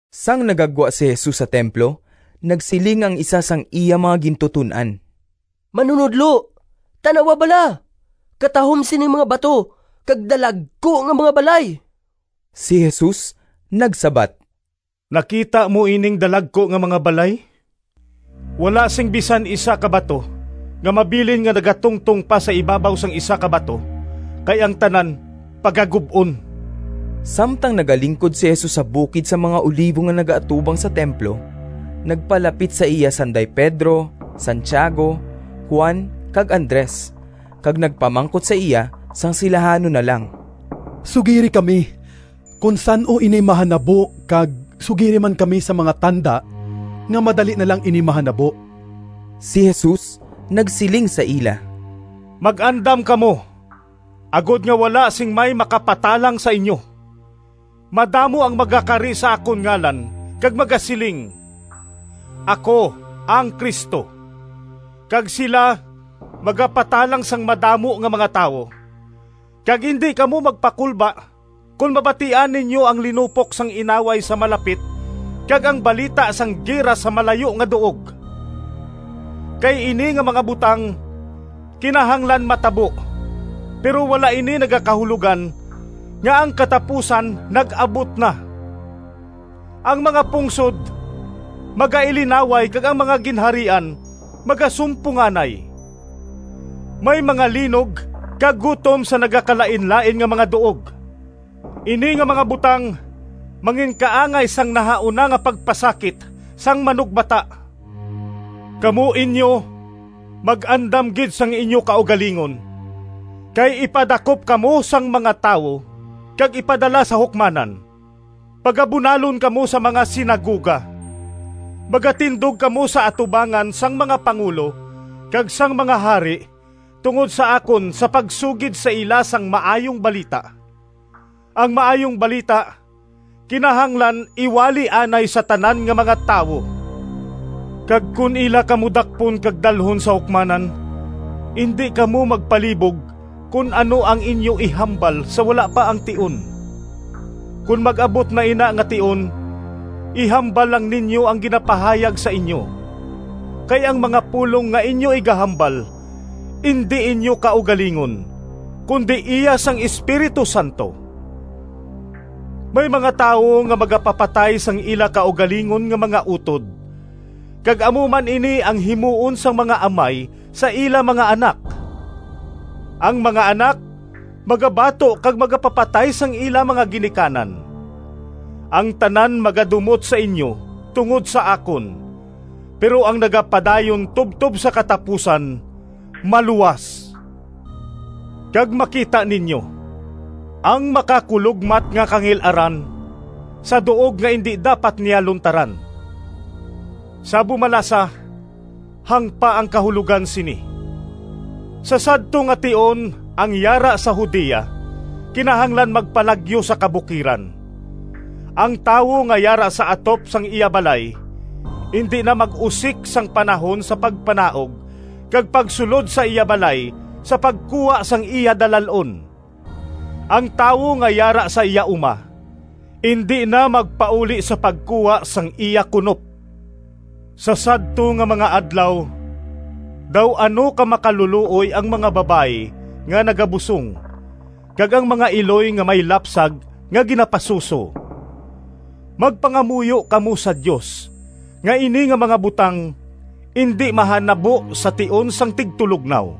Sang nagagwa si Jesus sa templo nagsiling ang isa sang iya mga gintuton-an, “Manunodlo, tan-awa bala! Katahom sining mga bato kag dalagku nga mga balay!” Si Jesus nagsabat, “Nakita mo ining dalagku nga mga balay? Wala sing bisan isa ka bato nga mabilin nga nagatungtong pa sa ibabaw sang isa ka bato kay ang tanan pagagub-on.” Samtang nagalingkod si Jesus sa bukid sang mga Olivo nga nagaatubang sa templo, nagpalapit sa iya sanday Pedro, Santiago, Juan kag Andres kag nagpamangkot sa iya sang silahanon na lang. “Sugiri kami kon san-o ini mahanabo kag sugiri man kami sang mga tanda nga madali na lang ini mahanabo.” Si Jesus nagsiling sa ila, “Mag-andam kamo, agod nga wala sing may makapatalang sa inyo. Madamo ang magakari sa akon ngalan kag magasiling, ‘Ako ang Cristo!’ kag sila magapatalang sang madamo nga mga tawo. Kag indi kamo magpakulba kon mabatian ninyo ang linupok sang inaway sa malapit kag ang balita sang gira sa malayo nga duog. Kay ini nga mga butang kinahanglan matabo, pero wala ini nagakahulogan nga ang katapusan nag-abot na. Ang mga pungsod magailinaway kag ang mga ginharian magasumponganay. May mga linog kag gutom sa nagakalainlain nga mga duog. Ini nga mga butang manginkaangay sang nahauna nga pagpasakit sang manugbata. “Kamo inyo mag-andam gid sang inyo kaugalingon, kay ipadakop kamo sang mga tawo kag ipadala sa hukmanan. Pagabunalon kamo sa mga sinagoga. Magatindog kamo sa atubangan sang mga pangulo kag sang mga hari tungod sa akon sa pagsugid sa ila sang Maayong Balita. Ang Maayong Balita kinahanglan iwali anay sa tanan nga mga tawo. Kag kon ila kamo dakpon kag dalhon sa hukmanan, indi kamo magpalibog kon ano ang inyo ihambal sa wala pa ang tion. Kon mag-abot na ina nga tion ihambal lang ninyo ang ginapahayag sa inyo. Kay ang mga pulong nga inyo igahambal indi inyo kaugalingon, kundi iya sang Espiritu Santo. May mga tawo nga magapapatay sang ila kaugalingon nga mga utod, kag amo man ini ang himuon sang mga amay sa ila mga anak. Ang mga anak magabato kag magapapatay sang ila mga ginikanan. Ang tanan magadumot sa inyo tungod sa akon, pero ang nagapadayon tubtob sa katapusan maluwas.” “Kag makita ninyo ‘Ang Makakulogmat nga Kangil-aran’ sa duog nga indi dapat niya luntaran.” (Sa bumalasa: hangpa ang kahulogan sini!) “Sa sadto nga tion ang yara sa Judea kinahanglan magpalagyo sa kabukiran. Ang tawo nga yara sa atop sang iya balay indi na mag-usik sang panahon sa pagpanaog kag pagsulod sa iya balay sa pagkuha sang iya dalal-on. Ang tawo nga yara sa iya uma indi na magpauli sa pagkuha sang iya kunop. Sa sadto nga mga adlaw daw ano ka makalulooy ang mga babayi nga nagabusong kag ang mga iloy nga may lapsag nga ginapasuso. Magpangamuyo kamo sa Dios nga ini nga mga butang indi mahanabo sa tion sang tigtulognaw!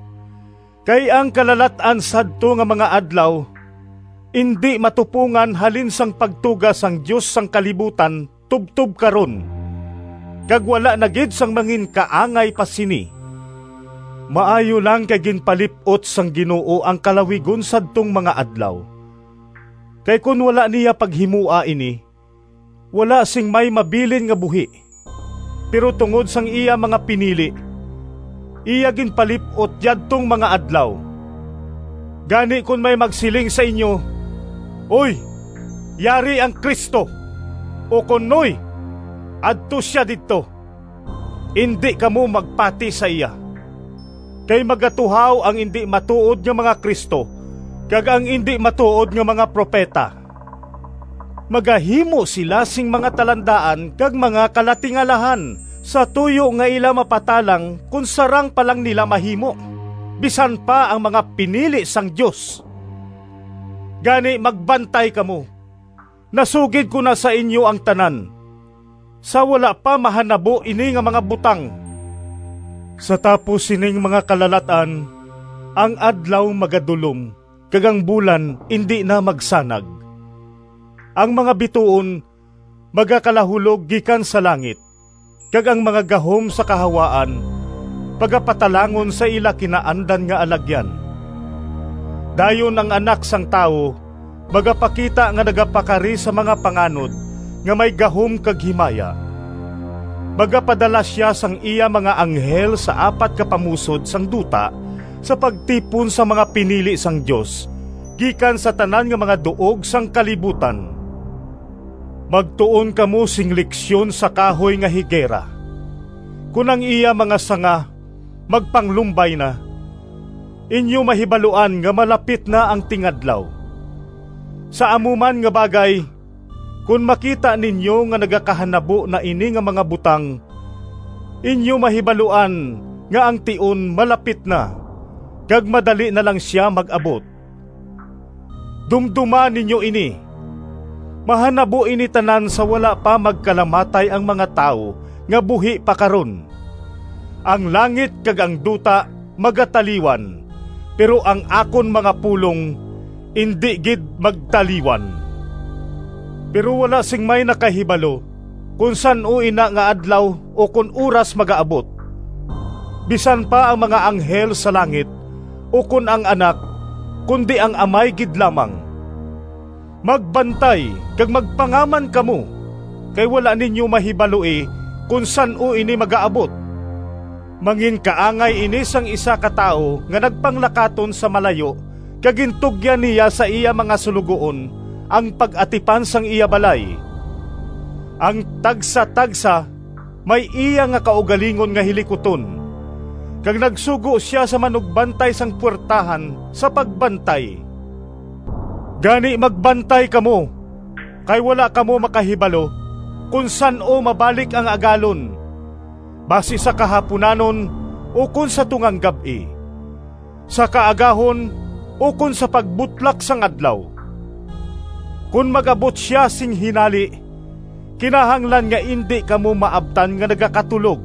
Kay ang kalalat-an sadto nga mga adlaw indi matupongan halin sang pagtuga sang Dios sang kalibutan tubtob karon. Kag wala na gid sing manginkaangay pa sini. Maayo lang kay ginpalip-ot sang Ginoo ang kalawigon sadtong mga adlaw, kay kon wala niya paghimoa ini, wala sing may mabilin nga buhi. Pero tungod sang iya mga pinili, iya ginpalip-ot yadtong mga adlaw. “Gani kon may magsiling sa inyo, ‘Hoy, yari ang Cristo!’ ukon ‘Hoy, adto sia didto!’ indi kamo magpati sa iya. Kay magatuhaw ang indi matuod nga mga Cristo kag ang indi matuod nga mga propeta. Magahimo sila sing mga talandaan kag mga kalatingalahan sa tuyo nga ila mapatalang, kon sarang pa lang nila mahimo, bisan pa ang mga pinili sang Dios. Gani, magbantay kamo! Nasugid ko na sa inyo ang tanan, sa wala pa mahanabo ini nga mga butang.” “Sa tapos sining mga kalalat-an, ang adlaw magadulom kag ang bulan indi na magsanag, ang mga bituon magakalahulog gikan sa langit, kag ang mga gahom sa kahawaan pagapatalangon sa ila kinaandan nga alagyan. Dayon ang Anak sang Tawo magapakita nga nagapakari sa mga panganod nga may gahom kag himaya. Magapadala sia sang iya mga anghel sa apat ka pamusod sang duta sa pagtipon sang mga pinili sang Dios gikan sa tanan nga mga duog sang kalibutan.” “Magtuon kamo sing leksyon sa kahoy nga higera. Kon ang iya mga sanga magpanglumbay na, inyo mahibaluan nga malapit na ang tingadlaw. Sa amo man nga bagay, kon makita ninyo nga nagakahanabo na ini nga mga butang, inyo mahibaluan nga ang tion malapit na, kag madali na lang sia mag-abot. Dumdoma ninyo ini! Mahanabo ini tanan sa wala pa magkalamatay ang mga tawo nga buhi pa karon. Ang langit kag ang duta magataliwan, pero ang akon mga pulong indi gid magtaliwan.” “Pero wala sing may nakahibalo kon san-o ina nga adlaw ukon oras magaabot, bisan pa ang mga anghel sa langit, ukon ang Anak, kundi ang Amay gid lamang. Magbantay kag magpangaman kamo, kay wala ninyo mahibaloi kon san-o ini magaabot. Manginkaangay ini sang isa ka tawo nga nagpanglakaton sa malayo kag gintugyan niya sa iya mga suloguon ang pag-atipan sang iya balay, ang tagsatagsa may iya nga kaugalingon nga hilikuton. Kag nagsugo sia sa manugbantay sang puwertahan sa pagbantay. Gani magbantay kamo kay wala kamo makahibalo kon san-o mabalik ang agalon, basi sa kahapunanon, ukon sa tungang gab-i, sa kaagahon ukon sa pagbutlak sang adlaw. Kon mag-abot sia sing hinali, kinahanglan nga indi kamo maabtan nga nagakatulog.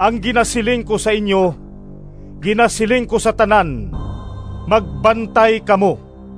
Ang ginasiling ko sa inyo ginasiling ko sa tanan, magbantay kamo!”